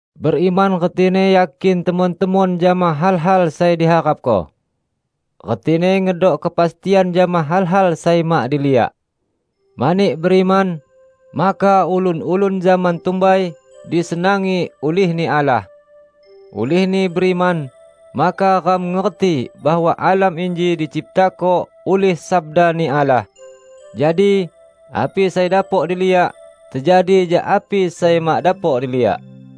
Beriman retini yakin temon-temon jama hal-hal sai diharapko, retini ngedok kepastian jama hal-hal sai mak diliak. Mani beriman, maka ulun-ulun zaman tumbai disenangi ulih-Ni Allah. Ulihni beriman, maka ram ngerti bahwa alam inji diciptako ulih sabda-Ni Allah; jadi, api sai dapok diliak, tejadi jak api sai mak dapok diliak.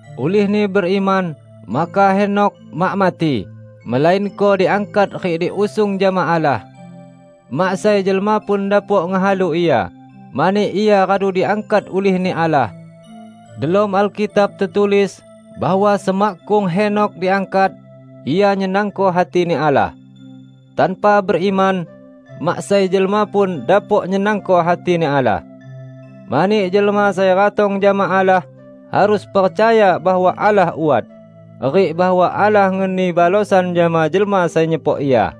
Ulihni beriman, maka Henokh mak mati, melainko diangkat rik diusung jama Allah. Mak sai jelma pun dapok ngehalu ia, mani ia radu diangkat ulih-Ni Allah. Delom Alkitab tetulis bahwa semakkung Henokh diangkat, ia nyenangko hati-Ni Allah. Tanpa beriman, mak sai jelma pun dapok nyenangko hati-Ni Allah. Mani jelma sai ratong jama Allah harus percaya bahwa Allah wat, rik bahwa Allah ngeni balosan jama jelma sai nyepok Ia.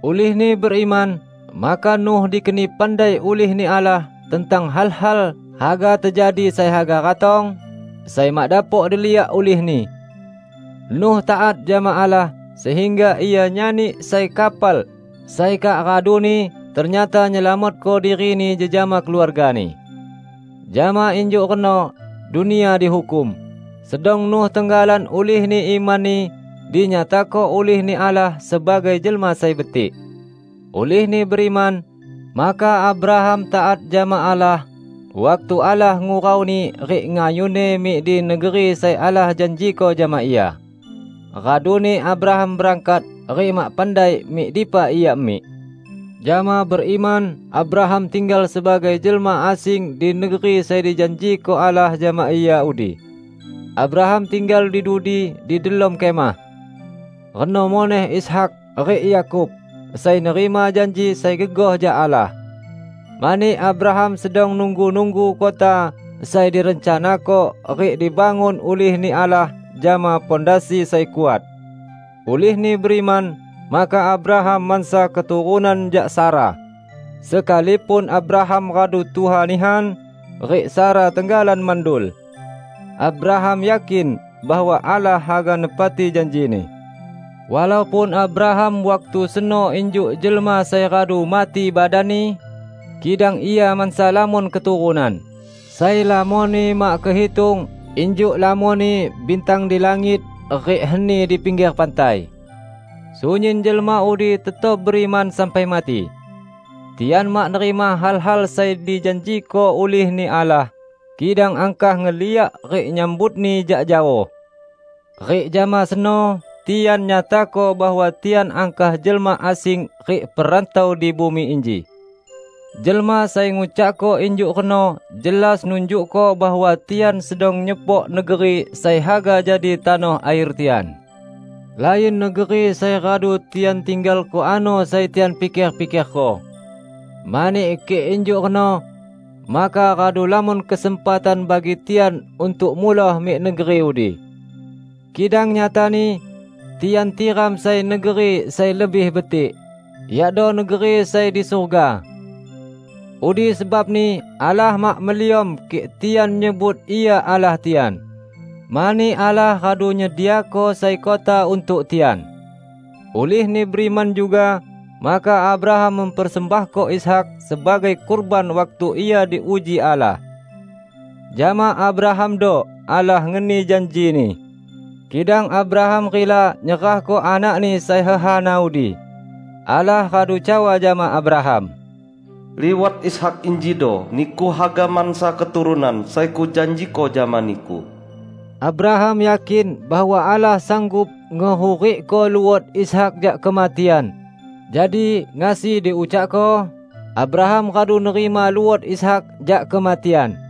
Ulihni beriman, maka Nuh dikeni pandai ulih-Ni Allah tentang hal-hal haga tejadi sai haga ratong, sai mak dapok diliak ulihni. Nuh taat jama Allah sehingga ia nyani sai kapal sai kak raduni ternyata nyelamatko dirini jejama keluargani. Jama injuk reno dunia dihukum, sedang Nuh tenggalan ulihni imanni dinyatako ulih-Ni Allah sebagai jelma sai betik. Ulihni beriman, maka Abraham taat jama Allah waktu Allah ngurauni rik ngayunni mik di negeri sai Allah janjiko jama ia. Raduni Abraham berangkat rik mak pandai mik dipa ia mik. Jama beriman, Abraham tinggal sebagai jelma asing di negeri sai dijanjiko Allah jama ia udi. Abraham tinggal di dudi di delom kemah. Reno muneh Ishak rik Yakub, sai nerima janji sai gegoh jak Allah. Mani Abraham sedang nunggu-nunggu kota sai direncanako rik dibangun ulih-Ni Allah jama pondasi sai kuat. Ulihni beriman, maka Abraham mansa keturunan jak Sara, sekalipun Abraham radu tuha nihan, rik Sara tenggalan mandul. Abraham yakin bahwa Allah haga nepati janji-Ni. Walaupun Abraham waktu seno injuk jelma sai radu mati badanni, kidang ia mansa lamon keturunan, sai lamonni mak kehitung -- injuk lamonni bintang di langit rik heni di pingger pantai. Sunyin jelma udi tetap beriman sampai mati. Tian mak nerima hal-hal sai dijanjiko ulih-Ni Allah, kidang angkah ngeliak rik nyambutni jak jaoh. Rik jama seno tian nyatako bahwa tian angkah jelma asing rik perantau di bumi inji. Jelma sai ngucakko injuk reno jelas nunjukko bahwa tian sedang nyepok negeri sai haga jadi tanoh air tian. Lain negeri sai radu tian tinggalko ano sai tian piker-pikerko. Mani kik injuk reno, maka radu lamon kesempatan bagi tian untuk muloh mik negeri udi. Kidang nyatani, tian tiram sai negeri sai lebih betik, yakdo negeri sai di surga. Udi sebabni Allah mak meliom kik tian nyebut Ia Allah tian, mani Allah radu nyediako sai kota untuk tian. Ulihni beriman juga, maka Abraham mempersembahko Ishak sebagai kurban waktu ia diuji Allah. Jama Abrahamdo Allah ngeni janji-Ni, kidang Abraham rila nyerahko anakni sai hehana udi. Allah radu cawa jama Abraham, "Liwat Ishak injido niku haga mansa keturunan sai Kujanjiko jama niku." Abraham yakin bahwa Allah sanggup ngehurikko luot Ishak jak kematian -- jadi, ngasi diucakko, Abraham radu nerima luot Ishak jak kematian.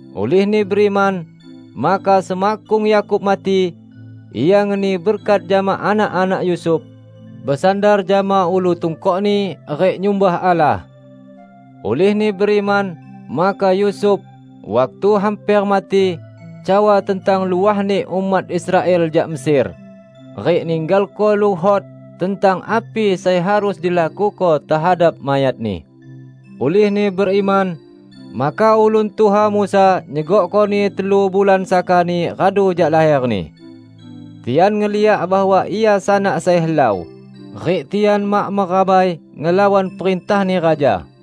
Ulihni beriman, maka semakkung Yakub mati, ia ngeni berkat jama anak-anak Yusuf -- besandar jama ulu tungkokni rik nyumbah Allah. Ulihni beriman, maka Yusuf -- waktu hamper mati -- cawa tentang luahni umat Israel jak Mesir, rik ninggalko luhot tentang api sai harus dilakuko tehadap mayatni. Ulihni beriman, maka ulun tuha Musa nyegokkoni telu bulan sakani radu jak laherni. Tian ngeliak bahwa ia sanak sai helau, rik tian mak merabai ngelawan perintahni raja.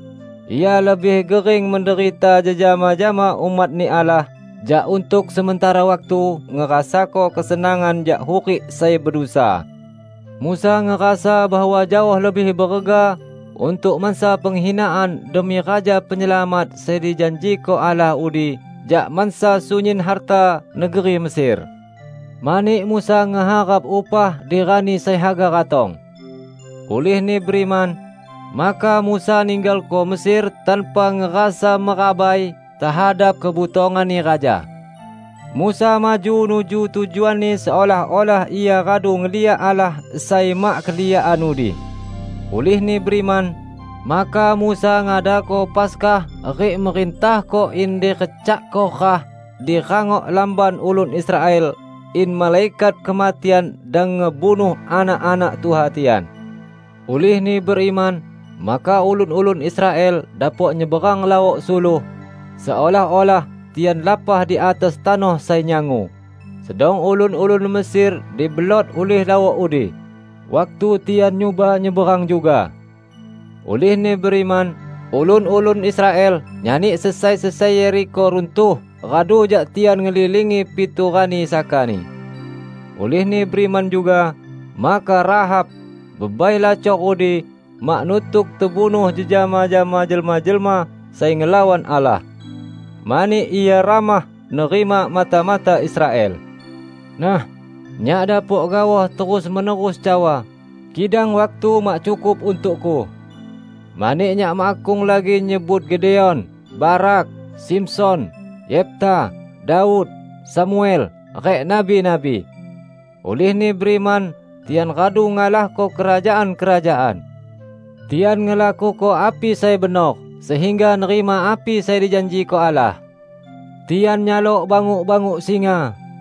Ia lebih gering menderita jejama jama umat-Ni Allah jak untuk sementara waktu ngerasako kesenangan jak hurik sai bedusa. Musa ngerasa bahwa jaoh lebih berega untuk mansa penghinaan demi Raja Penyelamat sai dijanjiko Allah udi jak mansa sunyin harta negeri Mesir, mani Musa ngeharap upah di rani sai haga ratong. Ulihni beriman, maka Musa ninggalko Mesir tanpa ngerasa merabai tehadap kebutonganni raja. Musa maju nuju tujuanni seolah-olah ia radu ngeliak Allah sai mak keliakan udi. Ulihni beriman, maka Musa ngadako Paskah rik merintahko in direcakko rah di rangok lamban ulun Israel in Malaikat Kematian dang ngebunuh anak-anak tuha tian. Ulihni beriman, maka ulun-ulun Israel dapok nyeberang Laok Suluh, seolah-olah tian lapah di atas tanoh sai nyangu, sedang ulun-ulun Mesir dibelot ulih lawok udi, waktu tian nyuba nyeberang juga. Ulihni beriman, ulun-ulun Israel nyani sesai-sesai Yerikho runtuh radu jak tian ngelilingi pitu rani sakani. Ulihni beriman juga, maka Rahab, bebai lacor udi, mak nutuk tebunuh jejama jama jelma-jelma sai ngelawan Allah; mani ia ramah nerima mata-mata Israel. Nah, nyak dapok gaoh terus-menerus cawa, kidang waktu mak cukup untukku. Mani nyak makkung lagi nyebut Gideon, Barak, Simson, Yefta, Daud, Samuel, rik nabi-nabi. Ulihni beriman tian radu ngalahko kerajaan-kerajaan. Tian ngelakuko api sai benor, sehingga nerima api sai dijanjiko Allah. Tian nyalok banguk-banguk singa;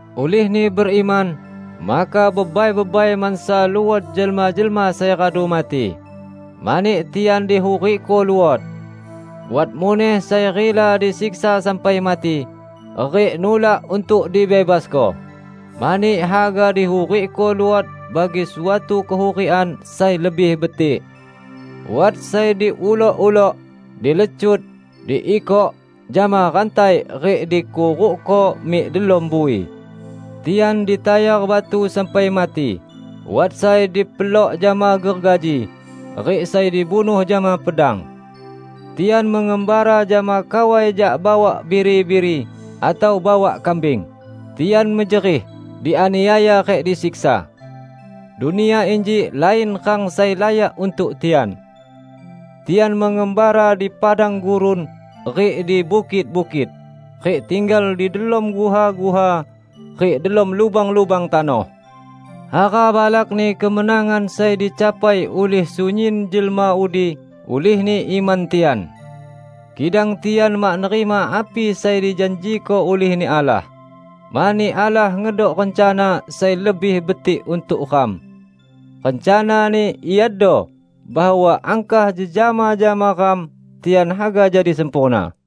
Ulihni beriman, maka bebai-bebai mansa luot jelma-jelma sai radu mati, mani tian dihurikko luot. Wat muneh sai rila disiksa sampai mati, rik nulak untuk dibebasko, mani haga dihurikko luot bagi suatu kehurikan sai lebih betik. Wat sai diulok-ulok, dilecut, diikok jama rantai rik dikurukko mik delom bui. Tian ditayar batu sampai mati, wat sai dipelok jama gergaji, rik sai dibunuh jama pedang. Tian mengembara jama kawai jak bawak biri-biri atau bawak kambing; tian mejerih, dianiaya rik disiksa. Dunia inji lain rang sai layak untuk tian. Tian mengembara di padang gurun rik di bukit-bukit, rik tinggal di delom guha-guha rik delom lubang-lubang tanoh. Hara balakni kemenangan sai dicapai ulih sunyin jelma udi ulihni iman tian! Kidang tian mak nerima api sai dijanjiko ulih-Ni Allah, mani Allah ngedok rencana sai lebih betik untuk ram. Rencana-Ni iado bahwa angkah jejama jama ram, tian haga jadi sempurna.